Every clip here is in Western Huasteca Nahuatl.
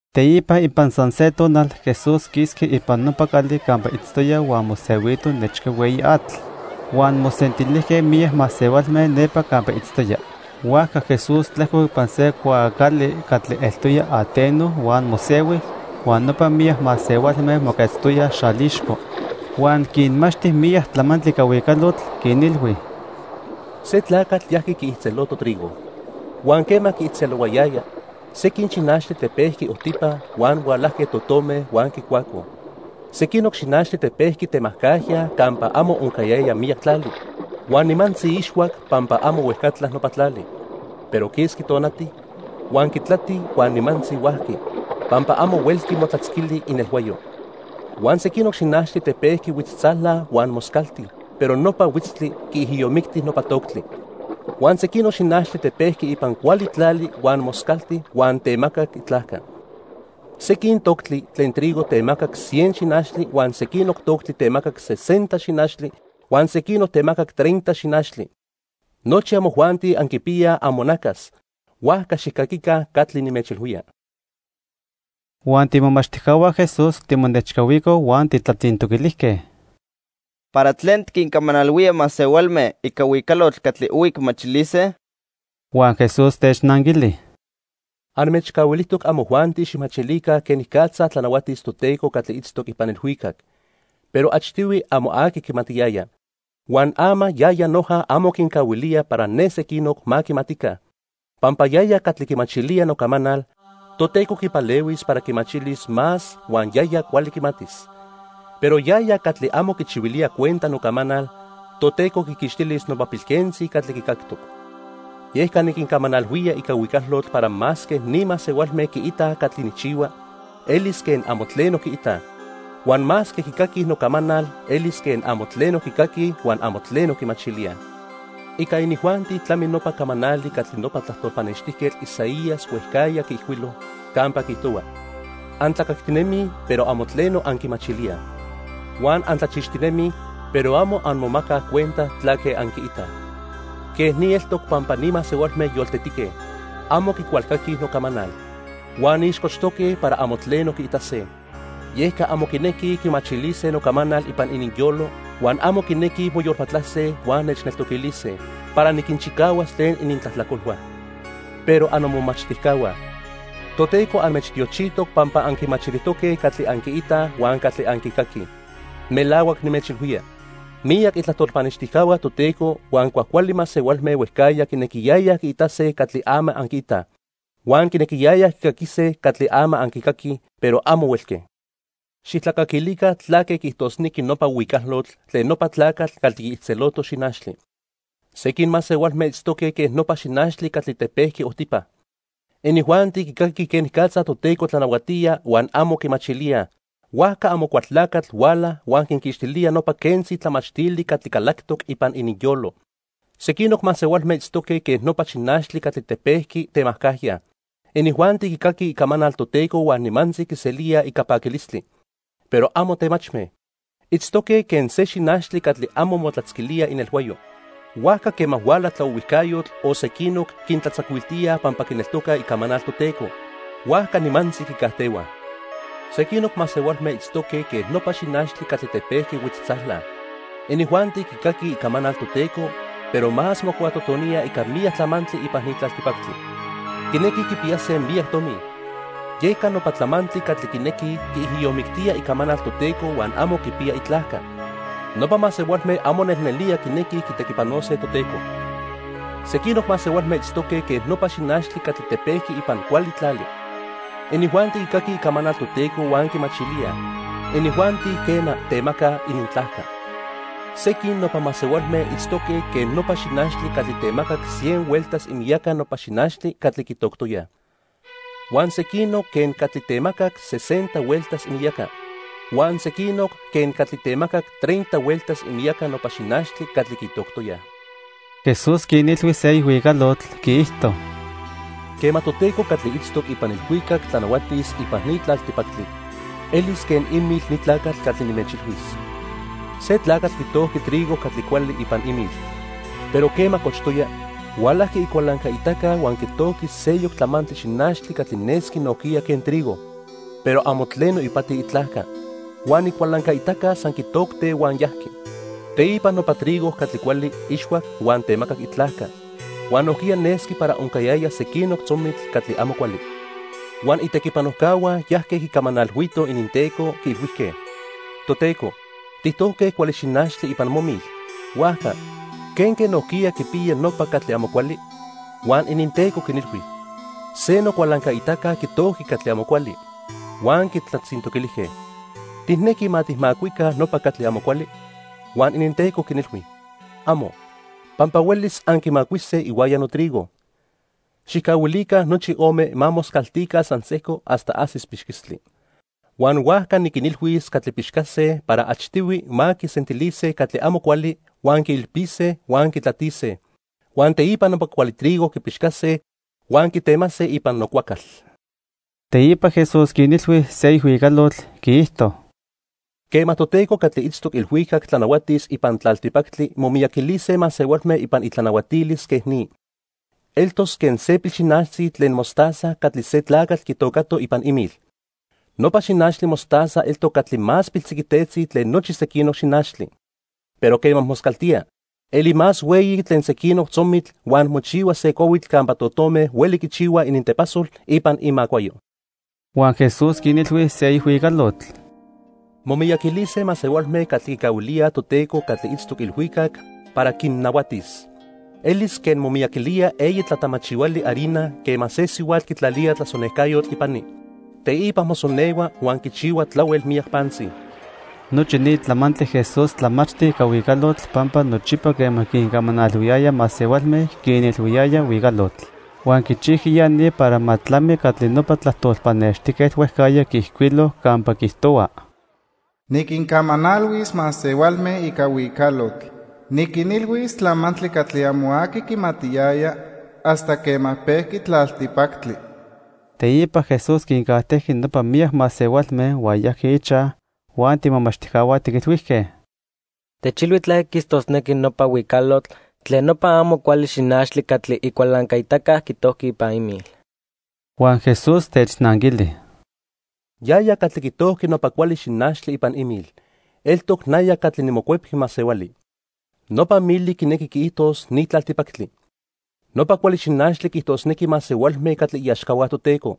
Teipa ipan san se nopa tonal, Jesús quisqui ipan nopa cali campa itztoya huan mosehuito nechca hueyi atl. Huan mosentilijque miyac masehualme nepa campa itztoya. Huajca Jesús tlejcoc ipan se cuaacali catli eltoya ateno huan mosehui, huan nopa miyac masehualme moquetztoyaj xalixco. Huan quinmachti miyac tlamantli ica huicalotl, quinilhui: "Se tlacatl yajqui quiijtzeloto trigo. Huan quema quiijtzelohuayaya, sequin xinachtli tepejqui ojtipa huan hualajque totome huan quicuacoj. Sequinoc xinachtli tepejqui temajcajya campa amo oncayaya miyac tlali, huan nimantzi ixhuac pampa amo huejcatla nopa tlali. Pero quisqui tonati, huan quitlati huan nimantzi huajqui, pampa amo huelqui motlatzquili inelhuayo. Huan sequinoc xinachtli tepejqui huitztzala huan moscalti, pero nopa huitztli quiijiyomicti nopa toctli. Huan sequinoc xinachtli tepejqui ipan cuali tlali huan moscalti huan temacac itlajca. Sequin toctli tlen trigo temacac cien xinachtli huan sequinoc toctli temacac sesenta xinachtli, huan sequinoc temacac treinta xinachtli. Nochi amojuanti anquipiyaj amonacas, huajca xijcaquica catli nimechilhuía." Huan tiimomachtijcahua Jesús timonechcahuicoj huan tijtlatzintoquilijque: "¿Para tlen tiquincamanalhuía masehualme ica huicalotl catli ohui quimachilise?" Huan Jesús technanquili: "Anmechcahuilijtoc amojuanti xijmachilica quenicatza tlanahuatis Toteco catli itztoc ipan ilhuicac. Pero achtihui amo aqui quimatiyaya, huan ama yaya noja amo quincahuilía para ne sequinoc ma quimatica. Pampa yaya catli quimachilía nocamanal, Toteco quipalehuis para quimachilis más huan yaya cuali quimatis. Pero yaya catli amo quichihuilía cuenta nocamanal, Toteco quiquixtilis nopa pilquentzi catli quicactoc. Yeca niquincamanalhuía ica huicalotl para masque ni masehualme quiitaj catli nijchihua, elis quen amo tleno quiitaj. Huan masque quicaquij nocamanal, elis quen amo tleno quicaquij huan amo tleno quimachilíaj. Ica inijuanti tlami nopa camanali catli nopa tlajtol pannextijquetl Isaías huejcajya quiijcuilo, campa quiijtohua: 'Antlacactinemij, pero amo tleno anquimachilíaj. Huan antlachixtinemij, pero amo anmomacaj cuenta tlaque anquiitaj. Quej ni eltoc pampa ni masehualme yoltetique. Amo quicualcaquij nocamanal. Huan ixcochtoque para amo tleno quiitase. Yeca amo quinequij quimachilise nocamanal ipan ininyolo, huan amo quinequij moyolpatlase huan nechneltoquilise, para niquinchicahuas tlen inintlajtlacolhua.' "Pero annomomachtijcahua, Toteco anmechtiochijtoc pampa anquimachilijtoque catli anquiitaj huan catli anquicaquij. Melahuac nimechilhuía, miyac itlajtol pannextijcahua Toteco huan cuajcuali masehualme huejcajya quinequiyayaj quiitase catli ama anquiitaj, huan quinequiyayaj quicaquise catli ama anquicaquij, pero amo huelque. "Xijtlacaquilica tlaque quiijtosnequi nopa huicalotl tlen nopa tlacatl catli quiijtzeloto xinachtli. Sequin masehualme itztoque quen nopa xinachtli catli tepejqui ojtipa. Inijuanti quicaquij quenicatza Toteco tlanahuatía huan amo quimachilíaj, huajca Amocualtlacatl huala huan quinquixtilía nopa quentzi tlamachtili catli calactoc ipan ininyolo. Sequinoc masehualme itztoque quen nopa xinachtli catli tepejqui temajcajya. Inijuanti quicaquij icamanal Toteco huan nimantzi quiselíaj ica paquilistli. Pero amo temachme. Itztoque quen se xinachtli catli amo motlatzquilía inelhuayo. Huajca quema huala tlaohuijcayotl o sequinoc quintlatzacuiltíaj pampa quineltocaj icamanal Toteco, huajca nimantzi quicajtehuaj. Sequinoc masehualme itztoque quen nopa xinachtli catli tepejqui huitztzala. Inijuanti quicaquij icamanal Toteco, pero más mocuatotoníaj ica miyac tlamantli ipan ni tlaltipactli. Quinequij quipiyase miyac tomi, yeca nopa tlamantli catli quinequij quiijiyomictíaj icamanal Toteco huan amo quipiya itlajca. Nopa masehualme amo nelnelía quinequij quitequipanose Toteco. Sequinoc masehualme itztoque quen nopa xinachtli catli tepejqui ipan cuali tlali. Inijuanti quicaquij icamanal Toteco huan quimachilíaj. Inijuanti, quena, temacaj inintlajca. Sequin nopa masehualme itztoque quen nopa xinachtli catli temacac cien hueltas imiyaca nopa xinachtli catli quitoctoyaj, huan sequinoc quen catli temacac sesenta hueltas imiyaca, huan sequinoc quen catli temacac treinta hueltas imiyaca nopa xinachtli catli quitoctoyaj." Jesús quinilhui seyoc huicalotl, quiijto: "Quema Toteco catli itztoc ipan ilhuicac tlanahuatis ipan ni tlaltipactli, elis quen imil ni tlacatl catli nimechilhuis. Se tlacatl quitojqui trigo catli cuali ipan imil. Pero quema cochtoya, hualajqui icualancaitaca huan quitojqui seyoc tlamantli xinachtli catli nesqui nojquiya quen trigo, pero amo tleno ipati itlajca. Huan icualancaitaca san quitocte huan yajqui. Teipa nopa trigo catli cuali ixhuac huan temacac itlajca. Huan nojquiya nesqui para oncayaya sequinoc tzomitl catli amo cuali. Huan itequipanojcahua yajque quicamanalhuitoj ininteco, quiilhuijque: 'Toteco, tijtojque cuali xinachtli ipan momil. Huajca ¿quenque nojquiya quipiya nopa catli amo cuali?' "Huan ininteco quinilhui: 'Se nocualancaitaca quitojqui catli amo cuali.' "Huan quitlatzintoquilijque: '¿Tijnequi ma tijmacuica nopa catli amo cuali?' "Huan ininteco quinilhui: 'Amo, pampa huelis anquimacuise ihuaya notrigo. Xijcahuilica nochi ome ma moscaltica san sejco hasta ajsis pixquistli. Huan huajca niquinilhuis catli pixcase para achtihui ma quisentilise catli amo cuali huan quiilpise huan quitlatise. Huan teipa nopa cuali trigo quipixcase huan quitemase ipan nocuacal.' " Teipa Jesús quinilhui seyoc huicalotl, quiijto: "Quema Toteco catli itztoc ilhuicac tlanahuatis ipan tlaltipactli momiyaquilise masehualme ipan itlanahuatilis quen ni. Eltos quen se pilxinachtzi tlen mostaza catli se tlacatl quitocato ipan imil. Nopa xinachtli mostaza eltoc catli más piltziquitetzi tlen nochi sequinoc xinachtli, pero quema moscaltía, eli más hueyi tlen sequinoc tzomitl huan mochihua se cuahuitl campa totome hueli quichihuaj inintepasol ipan imacuayo." Huan Jesús quinilhui seyoc huicalotl: "Momiyaquilise masehualme catli quicahuilíaj Toteco catli itztoc ilhuicac para quinnahuatis. Elis quen momiyaquilía eyi tlatamachihuali harina quema se sihuatl quitlalía tlasonejcayotl ipani. Teipa mosonehua huan quichihua tlahuel miyac pantzi." Nochi ni tlamantli Jesús tlamachti ica huicalotl, pampa nochipa quema quincamanalhuiyaya masehualme, quinilhuiyaya huicalotl. Huan quichijqui ya ni para ma tlami catli nopa tlajtol pannextijquetl huejcajya quiijcuilo campa quiijtohua: "Niquincamanalhuis masehualme ica huicalotl. Niquinilhuis tlamantli catli amo aqui quimatiyaya hasta quema pejqui tlaltipactli." Teipa Jesús quincajtejqui nopa miyac masehualme huan yajqui ichaj, huan tiimomachtijcahua tiquilhuijque: "Techilhui tlaque quiijtosnequi nopa huicalotl tlen nopa amo cuali xinachtli catli icualancaitaca quitojqui ipan imil." Huan Jesús technanquili: "Yaya catli quitojqui nopa cuali xinachtli ipan imil, eltoc naya catli niMocuepqui Masehuali. Nopa mili quinequi quiijtos ni tlaltipactli. Nopa cuali xinachtli quiijtosnequi masehualme catli iaxcahua Toteco.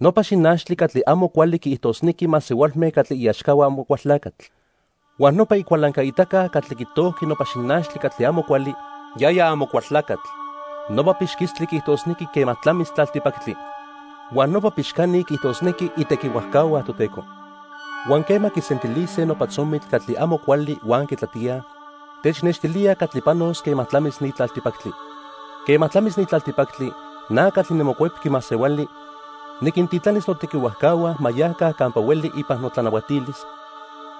Nopa xinachtli catli amo cuali quiijtosnequi masehualme catli iaxcahua Amocualtlacatl. Huan nopa icualancaitaca catli quitojqui nopa xinachtli catli amo cuali, yaya Amocualtlacatl. Nopa pixquistli quiijtosnequi quema tlamis tlaltipactli. Huan nopa pixcani quiijtosnequi itequihuajcahua Toteco. Huan quema quisentilise nopa tzomitl catli amo cuali huan quitlatíaj, technextilía catli panos quema tlamis ni tlaltipactli. Quema tlamis ni tlaltipactli, na catli niMocuepqui Masehuali niquintitlanis notequihuajcahua ma yaca campa hueli ipan notlanahuatilis,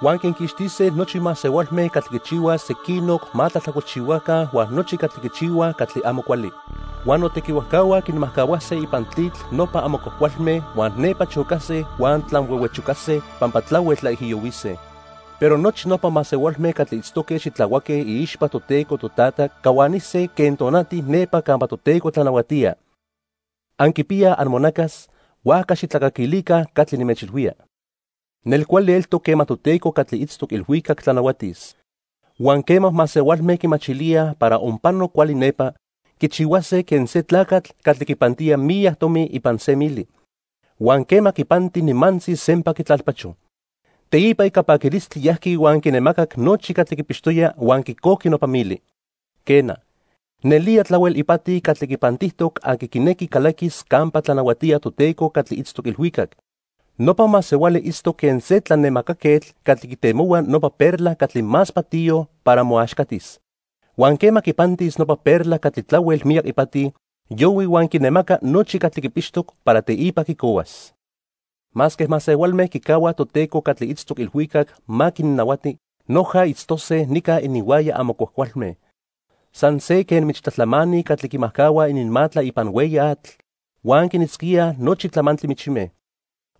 huan quinquixtise nochi masehualme catli quichihuaj sequinoc ma tlajtlacolchihuaca huan nochi catli quichihuaj catli amo cuali. Huan notequihuajcahua quinmajcahuase ipan tlitl nopa amo cuajcualme huan nepa chocase huan tlanhuehuechocase pampa tlahuel tlaijiyohuise. Pero nochi nopa masehualme catli itztoque xitlahuaque iixpa Toteco Totata cahuanise quen tonati nepa campa Toteco tlanahuatía. Anquipiyaj amonacas, huajca xijtlacaquilica catli nimechilhuía. "Nelcuali eltoc quema Toteco catli itztoc ilhuicac tlanahuatis. Huan quema masehualme quimachilíaj para onpano cuali nepa, quichihuase quen se tlacatl catli quipantía miyac tomi ipan se mili. Huan quema quipanti, nimantzi sempa quitlalpacho. Teipa ica paquilistli yajqui huan quinemacac nochi catli quipixtoya huan quicojqui nopa mili. "Quena, nelía tlahuel ipati catli quipantijtoc aqui quinequi calaquis campa tlanahuatía Toteco catli itztoc ilhuicac. Nopa masehuali itztoc quen se tlanemacaquetl catli quitemohua nopa perla catli más patiyo para moaxcatis. Huan quema quipantis nopa perla catli tlahuel miyac ipati, yohui huan quinemaca nochi catli quipixtoc para teipa quicohuas. "Masque masehualme quicahuaj Toteco catli itztoc ilhuicac ma quinnahuati, noja itztose nica ininhuaya amo cuajcualme. San se quen michtlajtlamani catli quimajcahuaj ininmatla ipan hueyi atl, huan quinitzquíaj nochi tlamantli michime.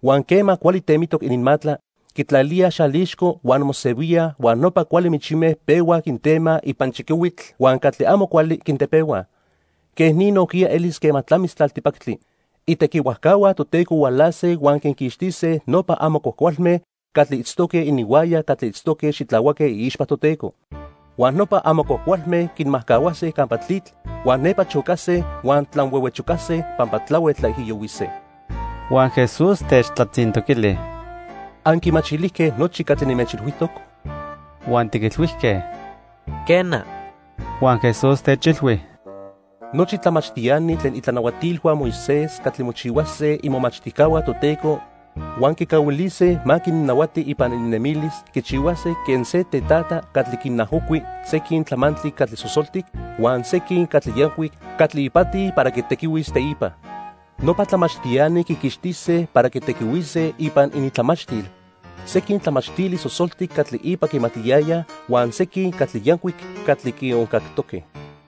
Huan quema cuali temitoc ininmatla, quitlalíaj xalixco huan mosehuíaj huan nopa cuali michime pehuaj quintemaj ipan chiquihuitl huan catli amo cuali quintepehuaj. Quej ni nojquiya elis quema tlamis tlaltipactli. Itequihuajcahua Toteco hualase huan quinquixtise nopa amo cuajcualme catli itztoque ininhuaya catli itztoque xitlahuaque iixpa Toteco. Huan nopa amo cuajcualme quinmajcahuase campa tlitl huan nepa chocase huan tlanhuehuechocase pampa tlahuel tlaijiyohuise." Huan Jesús techtlatzintoquili: —¿Anquimachilijque nochi catli nimechilhuijtoc? Huan tiquilhuijque: —Quena. Huan Jesús techilhui: —Nochi tlamachtiani tlen itlanahuatilhua Moisés catli mochihuase imomachtijcahua Toteco huan quicahuilise ma quinnahuati ipan ininnemilis quichihuase quen se tetata catli quinajocui sequin tlamantli catli sosoltic huan sequin catli yancuic catli ipati para quitequihuis teipa. Nopa tlamachtiani quiquixtise para quitequihuise ipan inintlamachtil sequin tlamachtili sosoltic catli ipa quimatiyayaj huan sequin catli yancuic catli quioncactoque.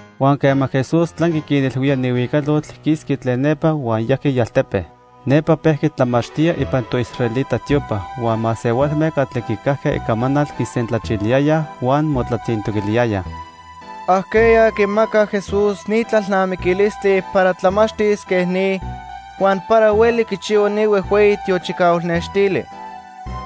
Huan quema Jesús tlanqui quinilhuía ni huicalotl, quisqui tlen nepa, huan yajqui ialtepe. Nepa pejqui tlamachtía ipan toisraelita tiopa. Huan masehualme catli quicajque icamanal quisentlachiliyayaj huan motlatzintoquiliyayaj: —¿Ajqueya quimaca Jesús ni tlalnamiquilistli para tlamachtis quen ni huan para hueli quichihua ni huejhueyi tiochicahual nextili?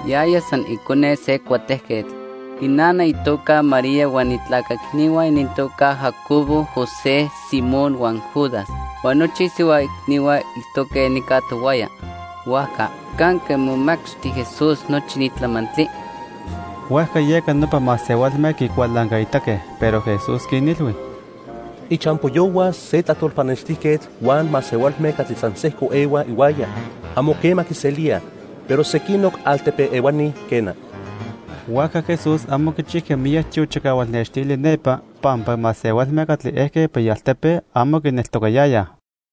Yaya san icone se cuatejquetl. Inana itoca María huan itlaca icnihua inintoca Jacobo, José, Simón huan Judas. Huan nochi isihua icnihua itztoque nica tohuaya. Huajca ¿canque momachti Jesús nochi ni tlamantli? Huajca yeca nopa masehualme quicualancaitaque. Pero Jesús quinilhui: —Ichampoyohua se tlajtol pannextijquetl huan masehualme catli san sejco ehuaj ihuaya, amo quema quiselíaj, pero sequinoc altepe ehuani, quena. Huajca Jesús amo quichijqui miyac tiochicahual nextili nepa pampa masehualme catli ejque ipan ialtepe amo quineltocayayaj.